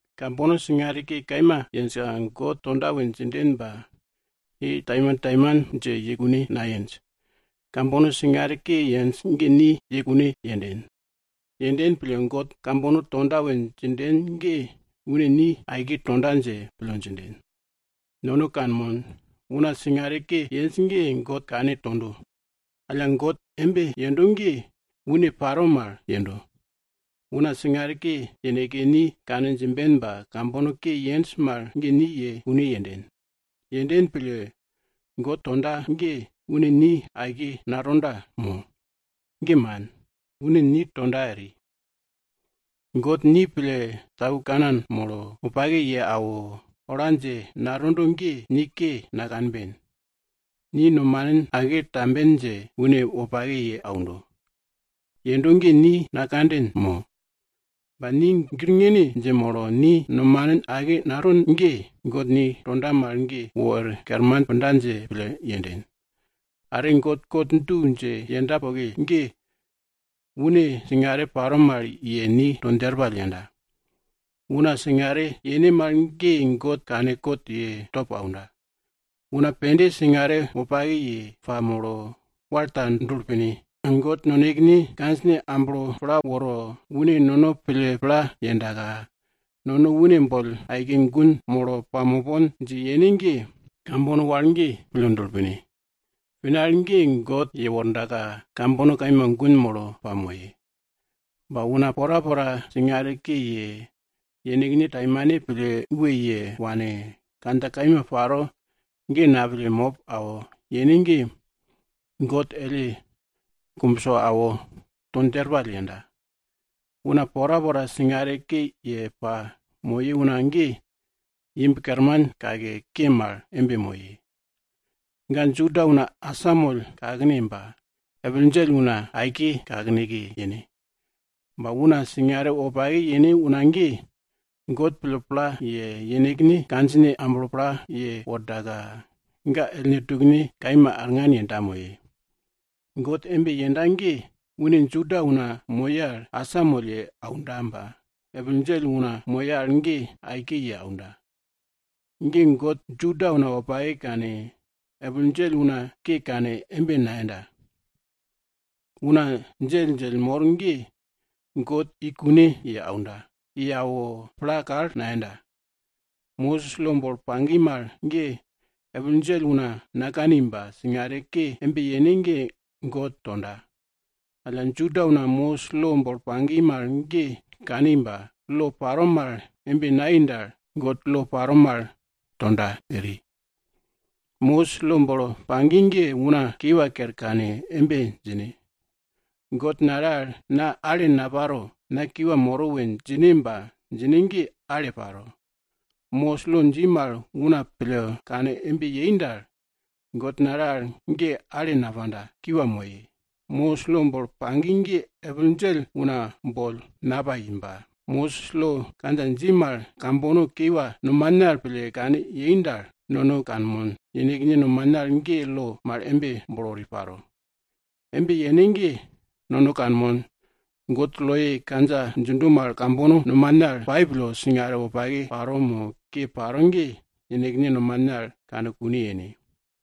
Kambono singare ke kaima yenjka God tonda we djinden ba ye taimantaiman dje kune nayenj. Kambono singare ke yenj ge ni ye kune yenden. Yenden pille, God kambono tonda we djinden ge une ni aike tonda dje pille djinden. Nono kanmon, una singare ke yenj ge God kane tondo. Alla God embe yendo ge une paro mal yendo. Una singare ke yeneke ni kane djimben ba kambono ke yenj mal ge ni ye kune yenden. Yenden pille, God tonda ge, une ni aike natonda mo? Ge man! Une ni tonda eri. God ni pille tau kanan molo, wopake ye awo, ola dje natondo ge, ni ke nakanben. Ni nomanin ake tamben dje une wopake ye aundo. Yendo ge ni nakanden mo? Ba ni girngine dje molo, ni nomanin ake naton ge, God ni tonda mal ge wor kerman punda dje pille yenden. Are God kot du dje yenda poke ge, une singare paro mal ye ni to djerpall yenda. Una singare yene mal ge God kane kot ye top aunda. Una pende singare wopake ye pamolo, wal ta dulo pine. God nonekene kandjine amblo pla woro, une nono pille pla yendaka, nono une boll aike gun molo pamopon dje yene ge, kambono wal ge pille dulo pine. Pine al ge God yewordaka, kambono kaima gun molo pamoye. Ba una porapora singare ke ye, yenekne taimane pille we ye wane, kandja kaima paro ge napille mop awo yene ge, God elle kumbso awo to djerpall yenda. Una porapora singare ke ye pamoye una ge, imb kerman kake, ke mal embe moye. Ga Juda una asamoll kakne ba epil djell una para aike kakneke yene. Ba una singare wopake yene una ge, God ga pille pla ye awo, yenekne kandjine amblo pla wordaka, ga ellne tukne kaima arngan yenda moye. God embe yenda ge, une Juda una moye al asamoll ye aunda ba, epil djell una moye al ge aike ye aunda. Ge God Juda una wopake kane, epil djell una ke kane embe nayenda. Una djelldjell mor ge God i kune ye aunda, awo pla kal nayenda. Mosis lo bolo pagi mal ge epil djell una nakani ba singare ke embe yene ge God tonda. Alla Juda una Mosis lo bolo pagi mal ge kani ba lo paro mal embe nayei dal, God lo paro mal tonda eri. Mosis lo bolo pagi ge una kiwa kere kane embe djine, God nale al na ale naparo, na kiwa moro we djine ba djine ge ale paro. Mosis lo dji mal una pille kane embe yei dal, God nale al ge ale napanda, kiwa moye. Mosis lo bolo pagi ge epil djell una boll napai ba, Mosis lo kandja dji mal kambono kiwa nomane al pille kane yei dal, nono kanmon, yenekne nomane al ge lo mal embe bolo wori paro. Embe yene ge nono kanmon, God loye kandja djindo mal kambono nomane al pai pille, singare wopake paro mo ke paro ge yenekne nomane al kane kune yene.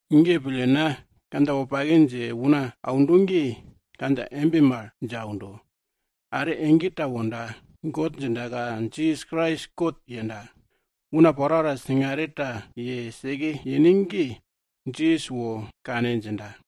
Ge pille, na kandja wopake dje una aundo ge kandja embe mal dje aundo. Are ege ta wonda, God djindaka, Jisas Krais kot yenda. Una porapora singare ta ye seke yene ge Jisas wo kane djinda.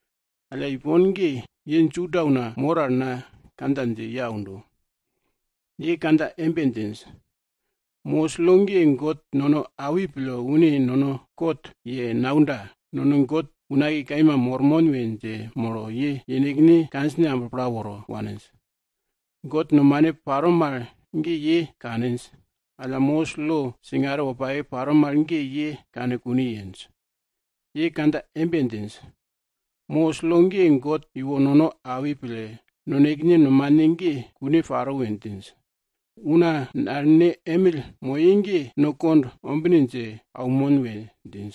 Alla ipon ge, ye Juda una mor al na kandja dje ye aundo. Ye kandja embe djinj, Mosis lo ge God nono awi pille une nono kot ye naunda, nono God unakiye kaima mormon we dje molo, ye yenekne kandjine amblo pla woro waninj. God nomane paro mal ge ye kaninj. Alla, Mosis lo singare wopake paro mal ge ye kane kune yenj. Ye kandja embe djinj, Mosis lo ge God iwo nono awi pille nonekene nomane ge kune paro we djinj. Una nalene emill moye ge no kond ombine dje aunmon we djinj.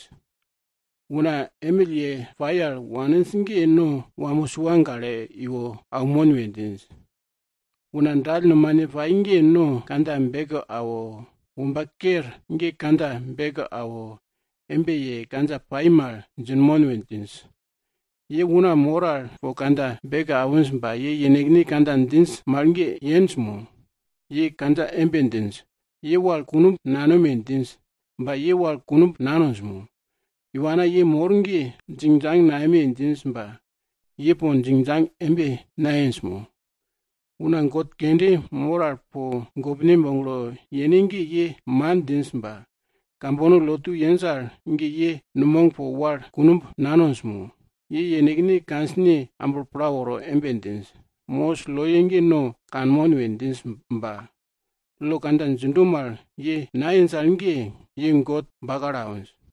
Una emill ye pai al waninj ge no wamo sua gale iwo aunmon we djinj. Una dall nomane pai ge no kandja beke awo, womba ker ge kandja beke awo, embe ye kandja pai mal djinmon we djinj. Ye una mor al po kandja beke awinj ba ye yenekne kandja djinj mal ge yenj mo? Ye kandja embe djinj, ye wal kunumb nanome! djinj ba ye wal kunumb nanonj mo? Iwa ana ye mor ge iwana djell wogane mo gamane boll djingdjang nayeme djinj ba ye po djingdjang nayenj mo? Una god kende mor al po gopne boglo yene ge ye man djinj ba, kambono lotu yenj al ge ye numog po wal kunumb nanonj mo? Ye yenekne kandjine amblo pla woro embe djinj, Mosis loye ge no kanmon we djinj ba lo kandja djindo mal ye nayenj al ge, ye God bakalo awinj.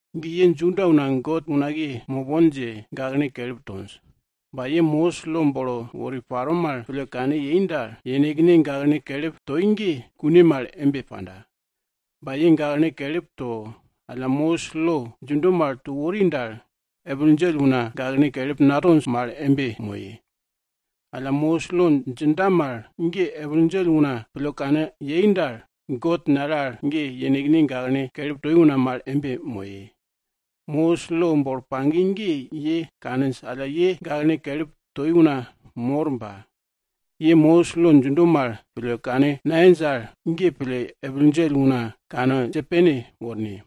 Ge ye Juda una God unakiye mopon dje gaklene kelip tonj, ba ye Mosis lo bolo wori paro mal pille kane yei dal, yenekne gaklene kelip toi ge kune mal embe panda. Ba ye gaklene kelip to, alla Mosis lo djindo mal to wori dal, epil djell una gaklene kelip natonj mal embe moye. Alla Mosis lo djinda mal ge epil djell una pille kane yei dal, God nale al ge yenekne gaklene kelip toi una mal embe moye. Mosis lo bolo pagi ge ye kaninj alla ye gaklene kelip toi una mor ba, ye Mosis lo djindo mal pille kane nayenj al, ge pille epil djell una kane dje pene worne.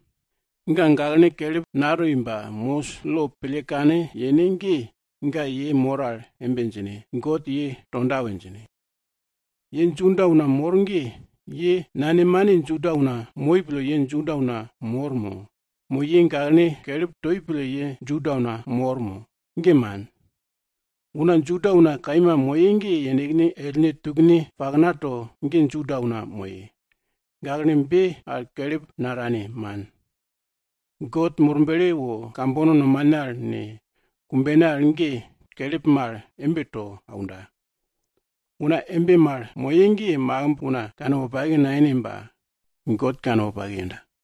Ga gaklene kelip natoi ba Mosis lo pille kane yene ge, ga ye mor al embe djine, God ye tonda we djine. Ye Juda una mor ge, ye nanemane Juda una moi pille ye Juda una mor mo? Mo ye gaklene kelip toi pille ye Juda una mor? Ge man. Una Juda una kaima moye ge yenekne ellne tukne paknato ge Juda una moye. Gaklene be al kelip natane, man, God Murble wo kambono nomane al ne, kumbene al ge kelip mal embe to aunda. Una embe mal moye ge makimb una kanwopake nayene ba God kanwopake yenda.